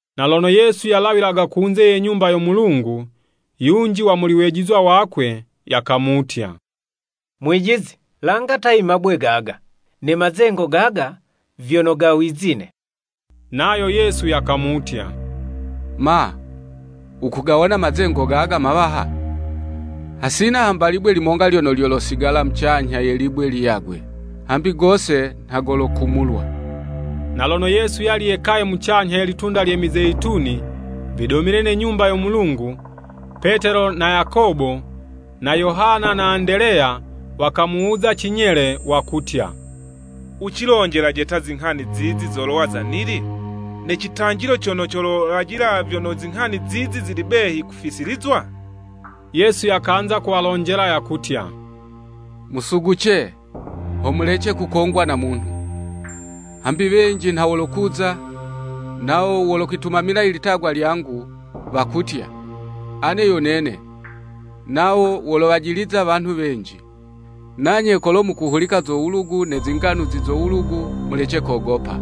Na lono Yesu yalawilaga kunze ye Nyumba yo Mulungu, yunji wa muli wejizwa wakwe yakamutya, “Mwijizi, langa ta imabwe gaga, ne mazengo gaga vyono ga wizine.” Nayo Yesu yakamutya, “Ma, wukugawona mazengo gaga mawaha? Hasina hamba libwe limonga lyono lyolosigala mucanyha ye libwe liyagwe, hambi gose nha golokumulwa.” Na lono Yesu yali yekaye mucanyha ye Litunda lye Mizeyituni vidomile ne Nyumba yo Mulungu, Petelo na Yakobo na Yohana na Andeleya wakamuwuza cinyele, wakutya, “Wucilonjelaje ta zinghani zizi zolowa za nili? Ne citanjiloci cono colajila vyono zinghani zizi zili behi kufisilizwa?” Yesu yakanza kuwalonjela yakutya, “Musuguce, ho mulece kukongwa na munhu. Hambi wenji nha wolokuza, nawo wolokwitumamila i litagwa lyangu, wakutya, ‘Ane yo nene!’ Nawo wolowajiliza wanhu wenji. Nanye kolo mukuhulika zo wulugu ne zinganuzi zo wulugu, mulece kogopa.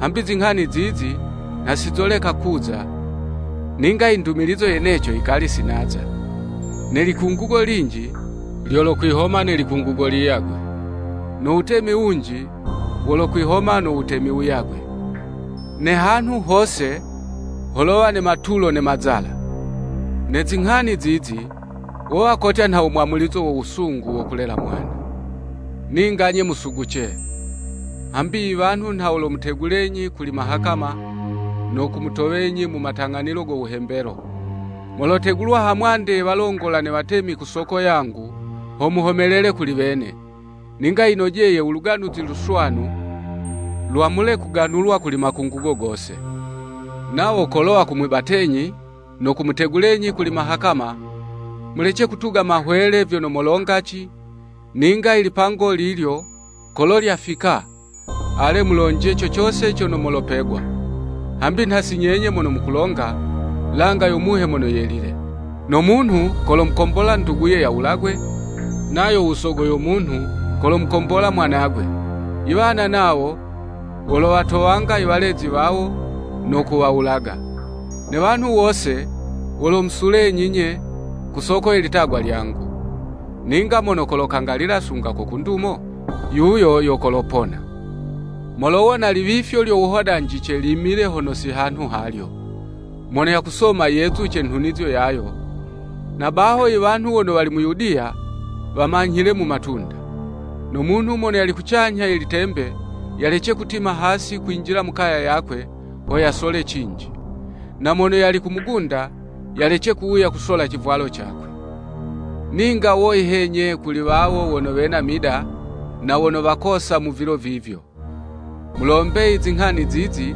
Hambi zinghani zizi nha sizoleka kuza, ninga indumilizo yeneco yikali sinaza. Ne likungugo linji lyolokwihoma ne likungugo liyagwe, no wutemi wunji wolokwihoma no wutemi wuyagwe, ne hanhu hose, holowa ne matulo ne mazala. Ne zinghani zizi, wowa kotya nha wo mwamulizo wo wusungu wo kulelela mwana. “Ninga 'nye musuguce. Hambi iwanhu nha wolomutegulenyi kuli mahakama, no kumutowenyi mu matang'anilo go wuhembelo. Molotegulwa ha mwande ye walongola ne watemi ku soko yangu, ho muhomelele kuli wene. Ninga yinojeye u Luganuzi Luswanu lwamule kuganulwa kuli makungugo gose. Nawo kolo wakumwibatenyi, no kumutegulenyi kuli mahakama, mulece kutuga mahwele vyono molongaci, ninga i lipango lilyo kolo lyafika, ale mulonje co cose cono molopegwa, hambi nha si nyenye mono mololonga, langa yo Muhe Mono Yelile. No munhu kolomukombola unduguye yawulagwe, nayo usogo yo munhu, kolomukombola umwanagwe, iwana nawo wolowatowanga iwalezi wawo no kuwawulaga. Ne wanhu wose wolomusulenyi'nye, ku soko ye litagwa lyangu. Ninga mono kolokangalila sunga ko ku ndumo, yuyo yo kolopona. “Molowona liwifyo lyo wuhodanjice limile hono si hanhu halyo. (Mono yakusoma yezuce nhunizo yayo!) Na baho iwanhu wono wali mu Yudiya, wamanyhile mu matunda. No munhu mono yali kucanyha ye litembe yalece kutima hasi no kwinjila mu kaya yakwe ho yasole cinji. Na mono yali ku mugunda, yalece kuwuya kusola civwalo cakwe. Ninga woyi he 'nye kuli wawo wono wena mida na wono wakosa mu vilo vivyo! Mulombe i zinghani zizi,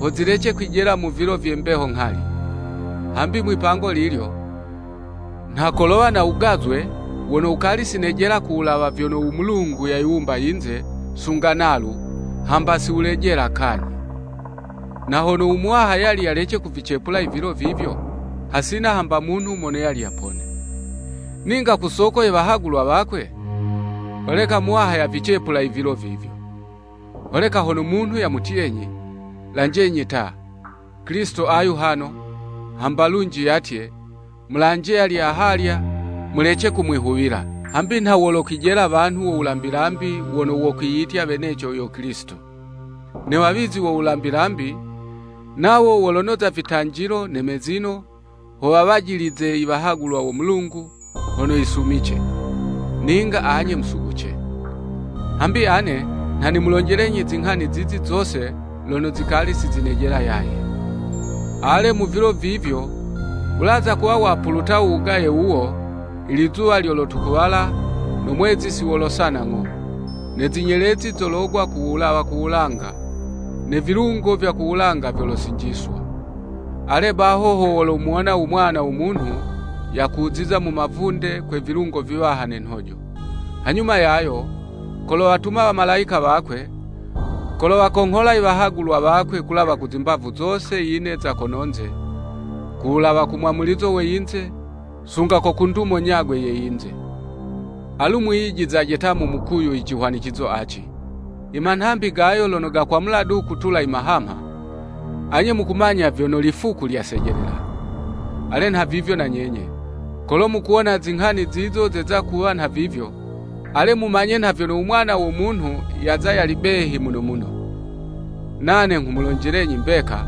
ho zilece kwijela mu vilo vye mbeho nghali. Hambi mwipango lilyo, nha kolowa no wugazwe wono wukali sinejela ku wulawa vyono u Mulungu yayiwumba yinze sunga nalu, hamba siwulejela kanyhi. Na hono u Muwaha yali yalece kuvicepula i vilo vivyo, hasina hamba munhu mono yali yapone. Ninga ku soko ye wahagulwa wakwe, holeka Muwaha yavicepula i vilo vivyo.” “Holeka hono munhu yamutyenyi, ‘Lanjenyi ta, Kilisito ayu hano!’ hamba lunji yatye, ‘Mulanje yali ahalya,’ mulece kumwihuwila. Hambi nha wolokwijela wanhu wo wulambi lambi wono wokwiyitya weneco yo Kilisito, ne wawizi wo wulambi lambi, nawo wolonoza vitanjilo ne mezino, ho wajilize i wahagulwa wo Mulungu, hono yisumice. Ninga anye musuguce. Hambi ane nha nimulonjelenyi zinghani zizi zose lono zikali sizinejela yaye. “Ale, mu vilo vivyo, wulaza kuwa wapuluta u wugaye wuwo, ilizuwa lyolotukuwala no mwezi siwolosana ng'o. Ne zinyelezi zologwa ku wulawa ku wulanga, ne vilungo vya ku wulanga vyolosinjiswa. Ale baho ho wolomuwona u Mwana wo Munhu yakuziza mu mavunde kwe vilungo viwaha ne nhojo. Hanyuma yayo kolowatuma wamalayika wakwe, kolowakonghola iwahagulwa wakwe kulawa ku zimbavu zose yine za kono'nze, ku wulawa ku mwamulizo we yinze, sunga ko ku ndumo nyagwe ye yinze.” “Alu mwiyijizizaje ta mu mukuyu i cihwanicizo aci, I manhambi gayo lono gakwamula du kutula i mahamha, anye mukumanya vyono lifuku lyasejelela. Ale nhavivyo na nyenye, kolo mukuwona zinghani zizo zeza kuwa nhavivyo, ale mumanye nha vyono u Mwana wo Munhu yaza yali behi muno muno. Nane nghumulonjelenyi mbeka,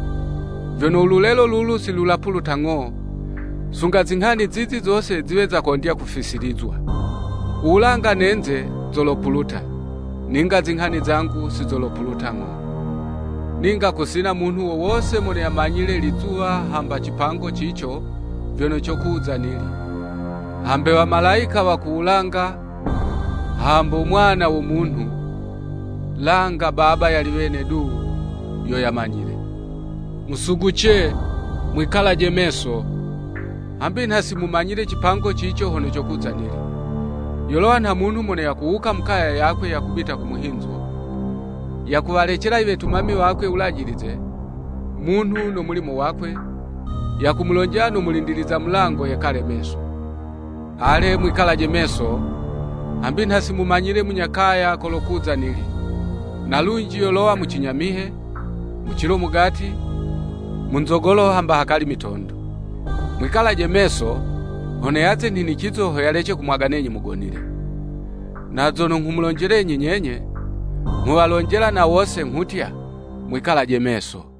vyono ululelo lulu silopuluta ng'o sunga zinghani zizi zose ziwe zakondya kufisilizwa. Uwulanga ne'nze zolopuluta, ninga zinghani zangu sizolopuluta ng'o.” “Ninga kusina munhu wo wose mono yamanyile lizuwa hamba cipango cico vyono cokuza nili, hambe wamalayika wa ku wulanga, hambo mwana wo munhu, langa Baba yali wene du, yo yamanyile. Musuguce, mwikalaje meso, hambi nha simumanyile cipango cico hono cokuza nili. Yolowa nha munhu mono yakuwuka mu kaya yakwe yakubita ku muhinzo, yakuwalecela i wetumami wakwe wulajilize, munhu no mulimo wakwe, yakamulonjela no mulindiliza mulango yekale meso. Ale, mwikalaje meso, hambi nha simumanyile munya kaya kolokuza nili, na lunji yolowa mu cinyamihe, mu cilo mugati, mu nzogolo hamba hakali mitondo. Mwikalaje meso hono yaze nhinicizo ho yalece kumwaganenyi mugonile. Na zono nghumulonjelenyi nyenye, nghuwalonjela na wose, nghutya, Mwikalaje meso!”